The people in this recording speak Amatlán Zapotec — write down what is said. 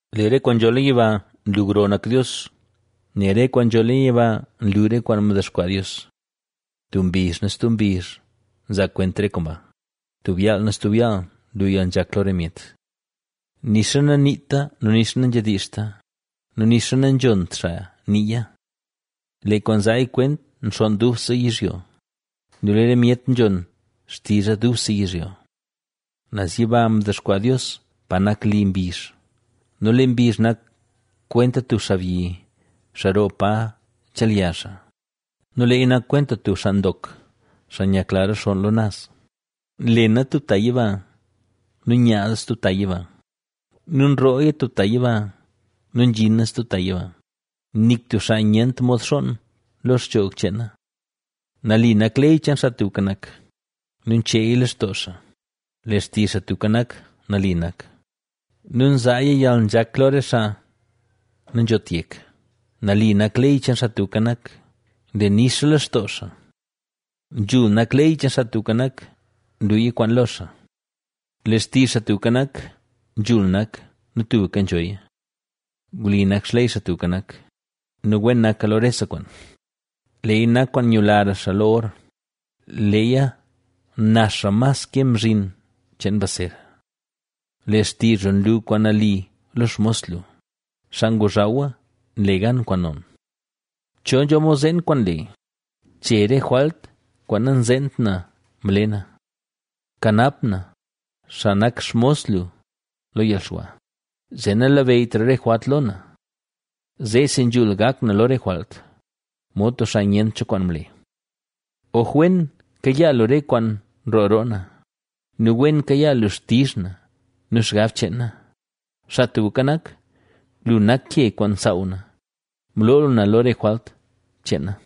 Lee re kwaan nzho leen yiba nlu gro doo nak Dios; nel re kwaan nzho leen yiba nlu re kwaan mdexkwaa Dios. Tub mbizh nu stub mbizh nzaa kwent re kwaan ba; tub yaal nu stub yaal nlu yalnzhak lo re myet. Nixa naniita nu nixa nanzhedizhta nu nixa nanzhont xaa niiya. Lee kwaan nzaaya kwent nxonn dubse yizhyo nu lee re myet nzhon xtizha dubse yizhyo. Naz yiba mdexkwaa Dios pa nak li mbizh. Nu lee mbizh nak kwenta tub xaabyi, xaa roo pa nchelya xaa; nu leeya nak kwenta tub xaa ndok, xaa nyakla rexonn lo naz. Nlena tub ta yiba nu nyaaza stub ta yiba; nu nrooya tub ta yiba nu nzhina stub ta yiba, nik tub xaa nyent mod xoon lo xchoog cheena. Nali nak ley cheen Xaa Tubka Nak, nu ncheeya lextoo xaa; Lee xtizh Xaa Tubka Nak, nali nak, nu nzaaya yalnzhak lo re xaa nanzhot yek. Nali nak ley cheen Xaa Tubka Nak; nle nixa lextoo xaa. Nzhul nak ley cheen Xaa Tubka Nak; nluya kwaan lo xaa. Lee xtizh Xaa Tubka Nak, nzhul nak nu tubka nzhoya. Wli nak xley Xaa Tubka Nak nu wen naka lo rese kwaan. Leeya nak kwaan nyulara xaa lo or, leeya naxra mas ke mzhin cheen mbaz ser. Lee xtizh lu nlu kwaan nali lo xmos lu, xaa ngozhawa nle gan kwaan non. ¿Cho nzho mod zeen kwaan nle? Che re jwalt kwaan nanzeent na mle na. Kanap na, xaa nak xmos lu, lo yalxwa; zee nanabeyytra re jwalt lo na. Zeesi nzhul gak na lo re jwalt; mod tub xaa nyent cho kwaan mle. Oj wen kayaa lu re kwaan nroo roo na nu wen kayaa lu xtizh na nu xgab cheen na; Xaa Tubka Nak, lu nak ke kwaan nsaaw na, mloo lu na lo re jwalt cheen na.